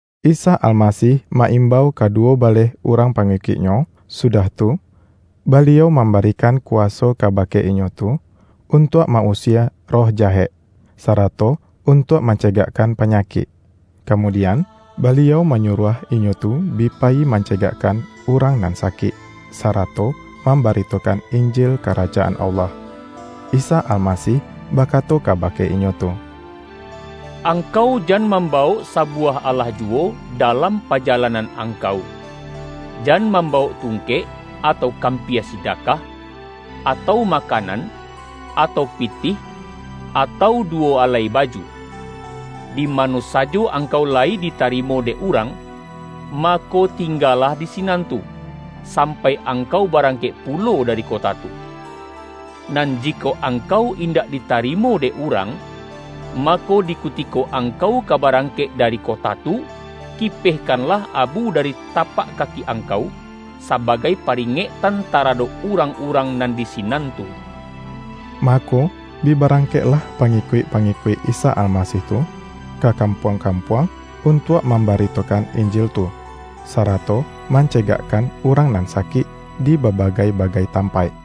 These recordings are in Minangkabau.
Isa Almasih ma-imbau kaduwo baleh urang pangikuik-Nyo, sudah tu, Baliau mambarikan kuwaso kaba-ke inyo tu, untuak ma-usie roh jahek, sarato untuak mancegakkan panyakik. Kamudian, Baliau manyuruah inyo tu bi payi mancegakkan urang nan sa-kik, sarato mambaritokan Injil Karaja-an Allah. Isa Almasih bakato kaba-ke inyo tu,”Angkau jan mambawok sabuwah alah juwo, dalam pajalanan angkau. Jan mambawok tungkek, atau kampia sidakah, atau makanan, atau pitih, atau duwo alai baju. Di mano sajo angkau layi ditarimo dek urang, mako, tinggalah di sinan tu, sampai angkau barangkek pulo dari kota tu. Nan jikok angkau indak ditarimo dek urang, mako, di kutiko angkau ka ba-rangkek dari kota tu, kipehkanlah abu dari tapak kaki angkau, sabagai pa-ringektan taradok urang-urang nan di sinan tu.” Mako, bi barangkeklah pangi-kuik-pangikuik Isa Almasih tu, ka kampuang-kampuang, untuak mam-baritokan Injil tu, sarato mancegak-kan urang nan sakik, dibabagai-ba-gai tampaik.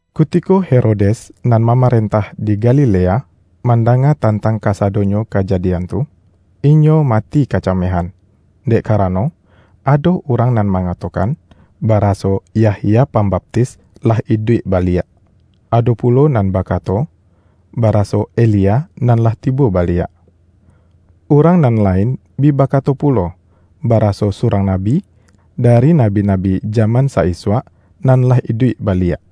Kutiko Herodes, nan mamarentah di Galilea, mandanga tantang kasado-nyo kajadian tu, inyo mati kacamehan. Dek karano, ado urang nan mangato-kan, baraso Yahya Pambaptis lah iduik baliak. Ado pulo nan bakato, baraso Elia nan lah tibo baliak. Urang nan la-in bi bakato pulo, baraso surang nabi, dari nabi-nabi jaman sa-isuak, nan lah iduik baliak.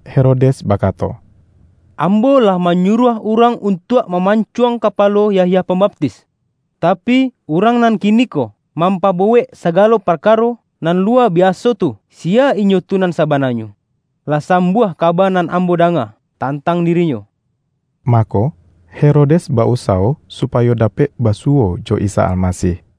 Herodes bakato,”Ambo lah manyuruah urang untuak maman-cuang kapalo Yahya Pambaptis. Tapi, Urang nan kiniko mampabuwek saga-lo parkaro nan luwa biaso tu, siya Inyo tu nan sabananyo? Lah sambuah ka-ba nan ambo danga tantang diri-Nyo.” Mako, Herodes ba-usawo supayo dapek basuwo jo Isa Almasih.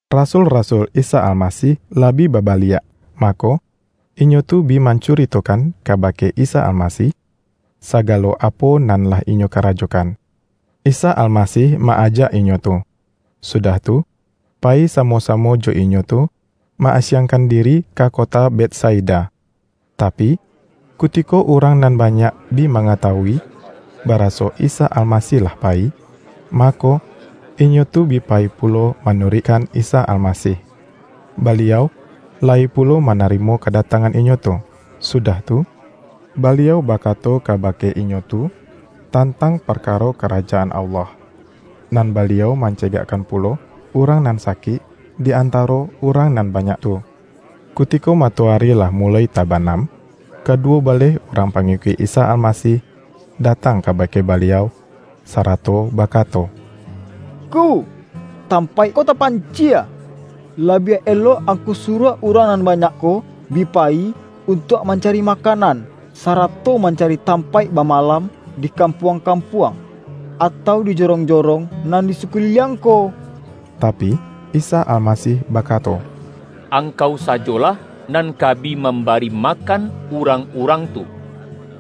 Rasul-rasul Isa Almasih lah bi ba-baliak, mako, inyo tu bi mancuritokan kabake Isa Almasih, sagalo apo nan lah inyo karajokan. Isa Almasih ma-ajak inyo tu, sudah tu, payi samo-sa-mo jo inyo tu ma-asiangkan diri ka kota Betsaida. Tapi, kutiko urang nan banyak bi mangatawui, baraso Isa Almasih lah payi, mako, inyo tu bi pa-yi pulo manuruikkan Isa Alamasih. Baliau layi pulo manarimo kadatang-an inyo tu, sudah tu, Baliau bakato kabake inyo tu, tantang parkaro Ka-rajaan Allah. Nan Baliau mancegak-kan pulo urang nan sakik, di antaro urang nan banyak tu. Kutiko matoari lah muloi taba-nam, kaduwo baleh urang pangikuik Isa Almasih datang kabake Baliau, sa-rato bakato,”Ngku, tampaik ko tapan-cie. Labiah elok Angku suruah urang nan banyak ko bi payi, untuak manca-ri makanan, sarato mancari tampaik bamalam di kampuang-kampuang, atau di jorong-jorong nan di sakuli-liang ko.” Tapi, Isa Almasih bakato,”Ang-kau sajolah nan ka bi mambari ma-kan urang-urang tu.”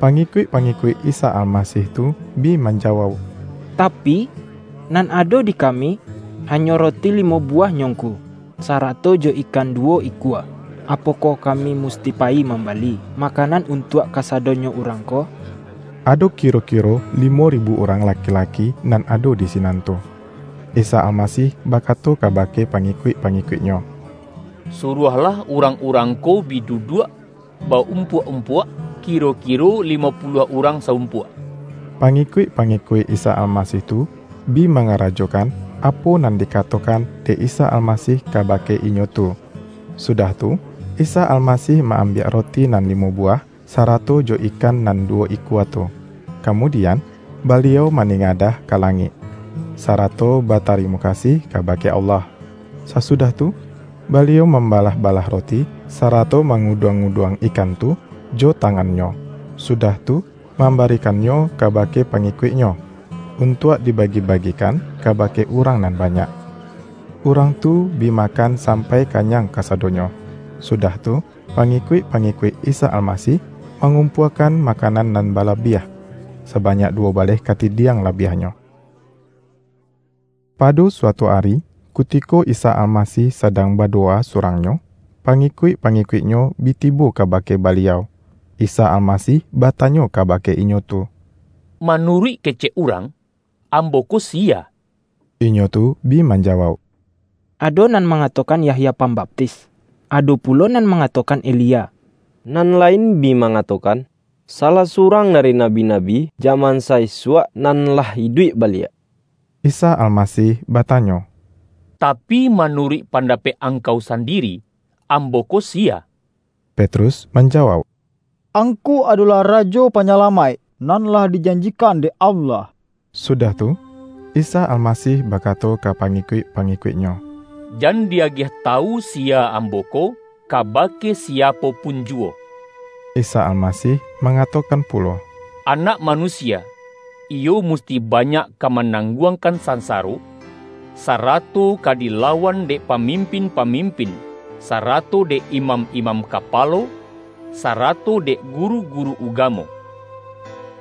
Pangikuik-pangikuik Isa Almasih tu bi manjawauk,”Tapi, nan ado di ka-mi, hanyo roti limo buwahnyo Ngku, sarato jo ikan duwo ikua. Apokoh ka-mi musti payi mambali makanan un-tuak kasadonyo urang ko?” (Ado ki-ro-kiro limo ribu urang laki-laki nan ado di sinan tu.) Isa Almasih bakato kabake pa-ngikuik-pangikuik-Nyo,”Suruahlah urang-urang ko bi duduak ba-umpuak-umpuak, kiro-kiro limo puluah urang sa-umpuak.” pangikuik-pangikuik Isa Almasih tu bi mangarajokan, apo nan dikatokan dek Isa Almasih kabake inyo tu. Sudah tu, Isa Almasih ma-ambiak roti nan limo buwah, sarato jo ikan nan duwo ikua tu, kamudian, Baliau maningadah ka langik, sarato batari-mo kasih kabake Allah. Sasudah tu, Baliau mambalah-balah roti, sarato manguduang-nguduang ikan tu, jo ta-ngan-Nyo, sudah tu, mambarikannyo kabake pangikuik-Nyo, untuak diba-gi-bagikan kabake urang nan banyak. Urang tu bi makan sampai kanyang kasadonyo. Sudah tu, pangikuik-pa-ngikuik Isa Almasih mangumpuakan makanan nan balabiah, sabanyak du-wo baleh katidiang labiahnyo. Pado suatu ari, kutiko Isa Alma-sih sadang badowa surang-Nyo, pa-ngikuik-pangikuik-Nyo bi tibo kaba-ke Baliau. Isa Almasih batanyo kabake inyo tu,”Manuruik kecek urang, Ambo ko siya?” Inyo tu bi manjawauk,”Ado nan mangatokan Yahya Pambaptis. Ado pulo nan mangatokan Elia, nan la-in bi mangatokan, salah surang da-ri nabi-nabi jaman sa-isuak nan lah iduik baliak.” Isa Almasih batanyo,”Tapi, manu-ruik pandapek angkau sandiri, Ambo ko siya?” Petrus manjawauk,”Angku adolah Rajo Panyalamaik, nan lah dijanjikan dek Allah.” Sudah tu, Isa Almasih bakato ka pangikuik-pangikuik-Nyo,”Jan di-agiah tawu siya Ambo ko, kabake si-apo pun juwo.” Isa Almasih mangatokan pulo,”Anak Manusia iyo musti banyak ka manangguangkan sansaro, sarato ka dilawan dek pamimpin-pa-mimpin, sarato dek imam-imam kapa-lo, sarato dek guru-guru ugamo.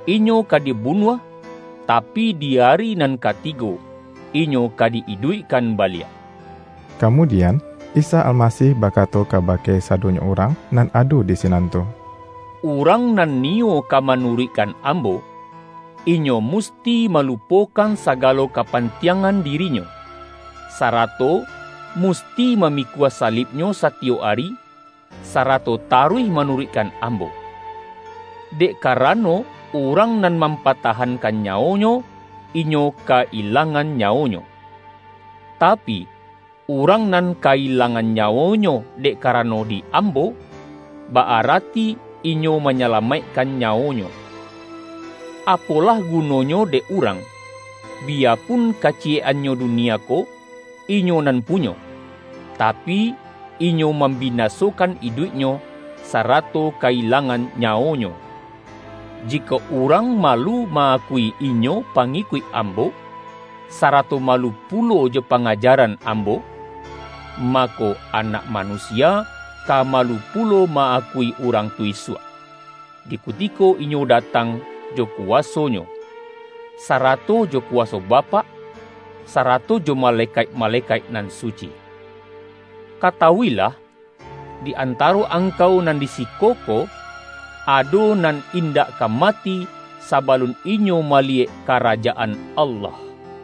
Inyo ka dibunuah, tapi, di ari nan katigo, Inyo ka di-iduikkan baliak.” Kamudian, Isa Almasih bakato ka-bake sadonyo urang nan ado di sinan tu,”Urang nan niyo ka manuruikkan Ambo, inyo musti malupokan sagalo kapantiangan dirinyo, sarato musti mamikua salibnyo satiyok ari, sara-to taruih manuruikkan Ambo. Dek karano, urang nan mampatahankan nyawonyo, inyo ka-ilangan nyawonyo. Tapi, urang nan ka-ilangan nyawonyo dek karano di Ambo, ba-arati inyo ma-nyalamaikkan nyawonyo. Apolah gunonyo dek urang, biyapun kaciyek-annyo dunia ko, inyo nan punyo, tapi inyo mambinasokan iduiknyo, sarato ka-ilangan nyawonyo? Jikok urang malu ma-akui inyo pangikuik Ambo, sarato malu pulo jo pangajaran Am-bo, mako, Anak Manusia ka malu pu-lo ma-akui urang tu isuak, di kutiko Inyo datang jo kuwaso-Nyo, sarato jo kuwaso Bapak, sarato jo malekaik-ma-lekaik nan suci! Katawuilah: di an-taro angkau nan di siko ko, ado nan indak ka mati, sabalun inyo maliyek Karajaan Allah.”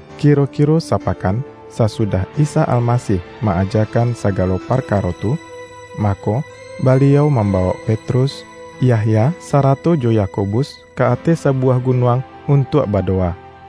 Kiro-kiro sapakan sasudah Isa Almasih ma-ajakan sagalo parka-ro tu, mako, Baliau mambawok Pet-rus, Yahya, sarato jo Yakobus ka ateh sabuwah gunuang untuak badowa.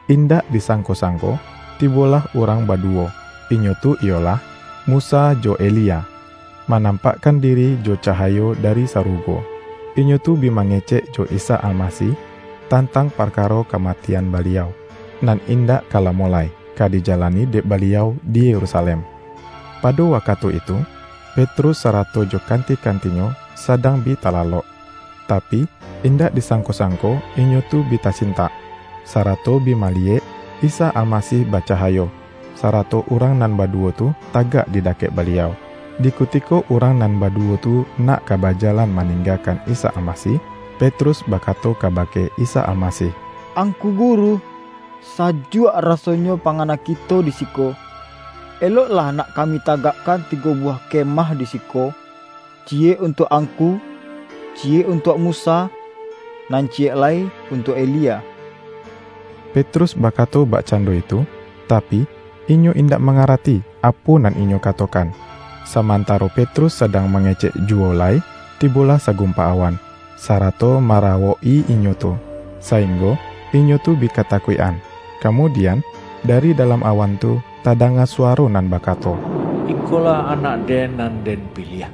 Indak disangko-sangko tibolah urang badu-wo, inyo tu iyolah, Musa jo Elia, manampakkan diri jo cahayo dari sarugo. Inyo tu bi mangecek jo Isa Almasih, tantang parkaro kamatian Baliau, nan indak ka lamo lai, ka dijalani dek Ba-liau di Yerusalem. Pado wakatu itu, Petrus sarato jo kanti-kantinyo sadang bi talalok, tapi, indak disangko-sangko inyo tu bi tasintak, sarato bi maliyek Isa Almasih bacahayo, sarato urang nan baduwo tu, tagak di dakek Ba-liau. Di kutiko urang nan baduwo tu nak ka bajalan maninggakan Isa Almasih, Petrus bakato kabake Isa Almasih,”Angku Guru, sajuak rasonyo pangana kito di siko. Eloklah nak ka-mi tagakkan tigo buwah kemah di si-ko: ciyek untuak Angku, ciyek untuak Musa, nan ciyek lai untuak Elia.” (Petrus bakato bakcando itu, tapi, inyo indak mangarati apo nan inyo katokan.) Samantaro Petrus sadang mange-cek juwo lai, tibolah sagumpa awan, sarato marawok-i inyo tu, sainggo inyo tu bi katakuik-an. Kamudian, dari dalam awan tu tadanga suwaro nan bakato,”Ikolah Anak-Den, nan Den-piliah.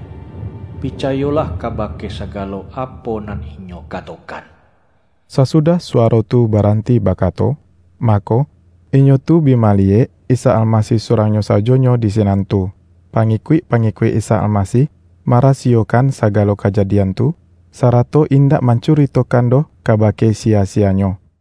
Picayolah kabake sagalo apo nan Inyo katokan!” Sasudah suwaro tu baranti bakato, mako, inyo tu bi maliyek Isa Almasih surang-Nyo sajonyo di sinan tu. Pa-ngikuik-pangikuik Isa Almasih ma-rasiyokan sagalo kajadian tu, sarato indak mancuritokan doh kabake si-ya-siyanyo.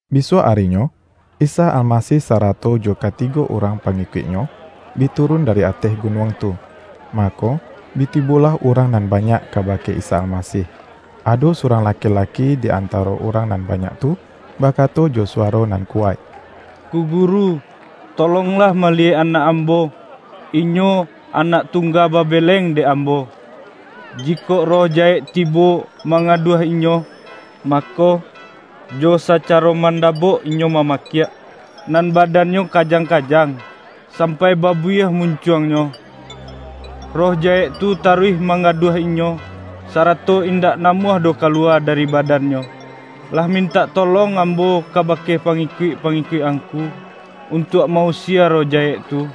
Bisuak arinyo, Isa Almasih sara-to jo katigo urang pangikuik-Nyo, bi turun dari ateh gunuang tu, mako, bi tibolah urang nan banyak kabake Isa Almasih. Ado surang laki-laki di antaro urang nan banyak tu, ba-kato jo suwaro nan kuwaik,”Ngku Guru, tolonglah maliyek anak ambo inyo anak tungga babeleng dek am-bo! Jikok roh jahek tibo mangga-duah inyo, mako, jo sacaro manda-bok inyo mamakiak, nan badannyo kajang-kajang, sampai babuyieh mun-cuangnyo. Roh jahek tu taruih mang-gaduah inyo, sarato indak namuah doh kaluwa dari badannyo! Lah mintak tolong ambo kabake pangi-kuik-pangikuik Angku, untuak ma-usie roh jahek tu,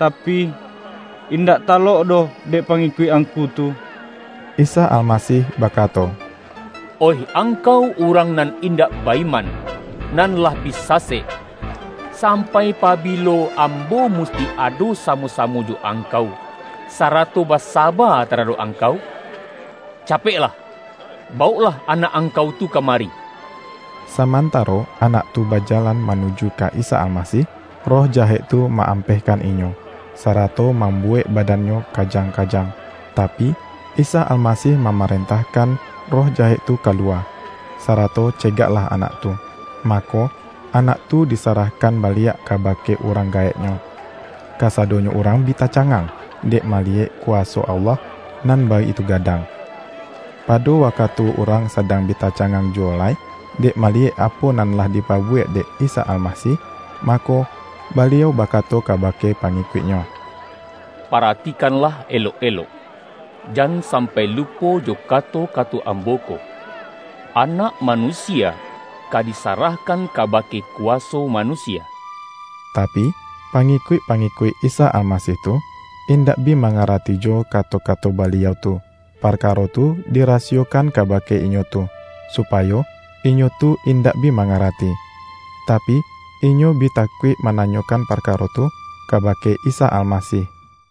tapi, indak talok doh dek pangikuik Angku tu.” Isa Almasih bakato,”Oih ang-kau urang nan indak ba-iman, nan lah bi sasek! Sampai pabilo Ambo musti ado samo-samo jo angkau, sarato basaba taradok angkau? Ca-peklah, bawoklah anak angkau tu ka mari!” Samantaro anak tu bajalan ma-nuju ka Isa Almasih, roh jahek tu ma-ampehkan inyo, sarato mambu-wek badannyo kajang-kajang. Tapi, Isa Almasih mamarentahkan roh ja-hek tu kaluwa, sarato cegaklah anak tu. Mako, anak tu disarahkan baliak kabake urang gaeknyo. Kasadonyo urang bi tacangang, dek maliyek ku-waso Allah nan baitu gadang. Pado wakatu urang sadang bi ta-cangang juwo lai, dek maliyek apo nan lah dipabuwek dek Isa Alma-sih, mako, Baliau bakato kabake pa-ngikuik-Nyo, ”paratikanlah elok-elok, jan sampai lupo jo kato-kato Ambo ko: Anak Manusia ka disarah-kan kabake kuwaso manusia.” Ta-pi, pangikuik-pangikuik Isa Almasih tu, indak bi mangarati jo kato-ka-to Baliau tu. Parkaro tu dirasiyokan kabake inyo tu, supayo inyo tu in-dak bi mangarati. Tapi, inyo bi ta-kuik mananyokan parkaro tu kaba-ke Isa Almasih.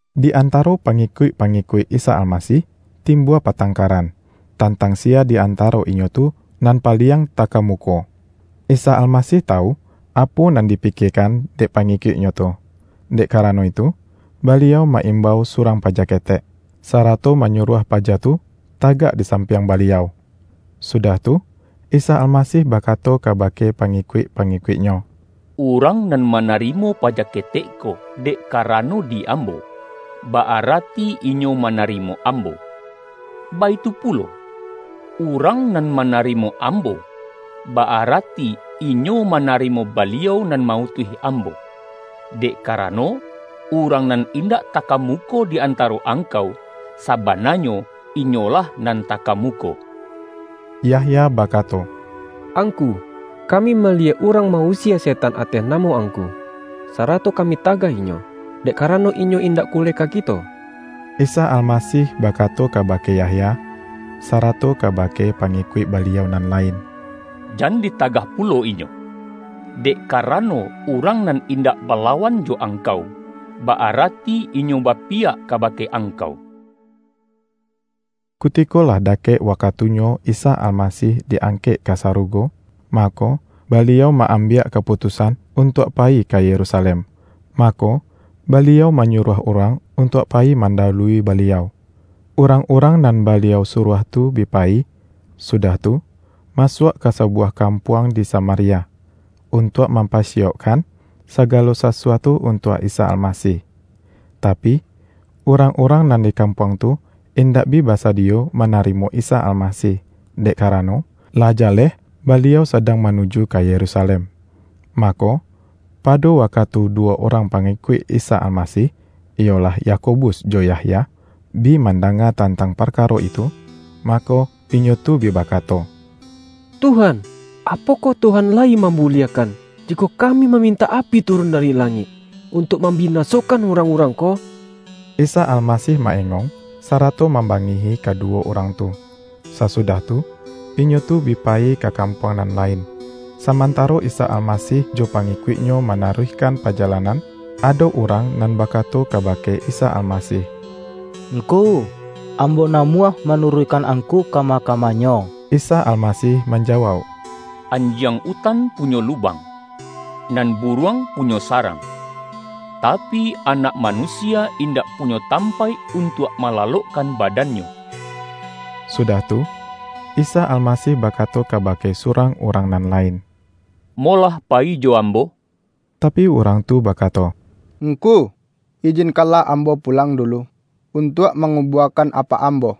Di antaro pangikuik-pangikuik Isa Almasih, timbua patangkaran, tantang siya di antaro inyo tu, nan paliang ta-kamuko. Isa Almasih tawu, apo nan dipikiekan dek pangikuik-Nyo tu, dek karano itu, Baliau ma-imbau surang paja ketek, sarato manyuruah paja tu tagak disampiang Baliau. Sudah tu, Isa Almasih bakato kabake pangikuik-pangikuik-Nyo,”Urang nan manarimo paja ketek ko, dek karano di Ambo, ba-arati inyo manarimo Ambo. Baitu pulo, urang nan manarimo Ambo, ba-arati inyo manarimo Baliau nan ma-utuih Ambo. Dek karano, urang nan indak takamuko di antaro angkau, sabana-nyo, inyolah nan takamuko!” Yahya bakato,”Angku, kami ma-liyek urang ma-usie setan ateh namo Angku, sarato kami tagah inyo, dek karano inyo indak kuleka kito.” Isa Almasih bakato kabake Yah-ya, sarato kabake pangikuik Baliau nan lain,”Jan ditagah pulo inyo, dek karano, urang nan indak balawan jo angkau, ba-arati inyo bapiyak kaba-ke angkau.” Kutiko lah dakek wakatunyo Isa Almasih di-angkek ka sarugo, mako, Ba-liau ma-ambiak kaputusan untuak payi ka Yerusalem. Mako, Baliau manyu-ruah urang untuak payi mandawului Ba-liau. Urang-urang nan Baliau suruah tu bi payi, sudah tu, masuak ka sabuwah kampuang di Samaria, untuak mam-pasiyaukkan sagalo sasuatu untuak Isa Almasih. Tapi, urang-urang nan di kampuang tu indak bi basadiyo mana-rimo Isa Almasih, dek karano, lah ja-leh Baliau sadang manuju ka Yerusalem Mako, pado wakatu duwo urang pa-ngikuik Isa Almasih, iyolah, Yakobus jo Yahya, bi mandanga tantang parkaro itu, mako, inyo tu bi bakato,”Tuhan, apokoh Tuhan layi mambuliahkan, jikok kami mamintak api turun dari langik, untuak mambinasokan urang-urang ko?” Isa Almasih ma-engong, sara-to mambangihi kaduwo urang tu. Sasudah tu, inyo tu bi payi ka kam-puang nan lain. Samantaro Isa Almasih jo pangi-kuik-Nyo manaruihkan pajalanan, ado urang nan bakato kabake Isa Almasih,”Ngku, ambo namuah manuruikkan Angku kama-kamanyo!” Isa Almasih manjawauk,”Anjiang utan punyo lubang, nan buruang pu-nyo sarang, tapi, Anak Manusia indak punyo tampaik untuak malalokkan badan-Nyo.” Sudah tu, Isa Alma-sih bakato kabake surang urang nan lain,”Molah payi jo Ambo.” Tapi, urang tu bakato,”Ngku, ijin-kanlah ambo pulang dulu, untuak ma-ngubuakan apak ambo.”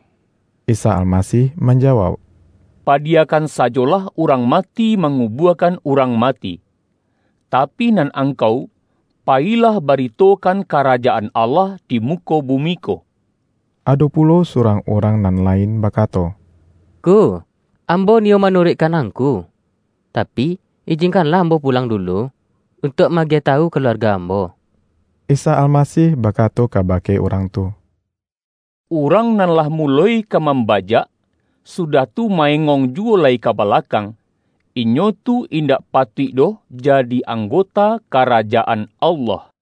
Isa Almasih manjawauk,”Padiya-kan sajolah urang mati mangubuakan urang mati. Tapi, nan angkau payi-lah baritokan Karajaan Allah di mu-ko bumi ko.” Ado pulo surang urang nan lain bakato,”Ngku, ambo niyo manuruik-kan Angku, tapi, ijinkanlah ambo pu-lang dulu, untuak ma-agiah tawu ka-luarga ambo.” Isa Almasih bakato kabake urang tu,”Urang nan lah muloi ka mamba-jak, sudah tu, ma-engong juwo lai ka balakang, inyo tu indak patuik doh ja-di anggota Karajaan Allah.”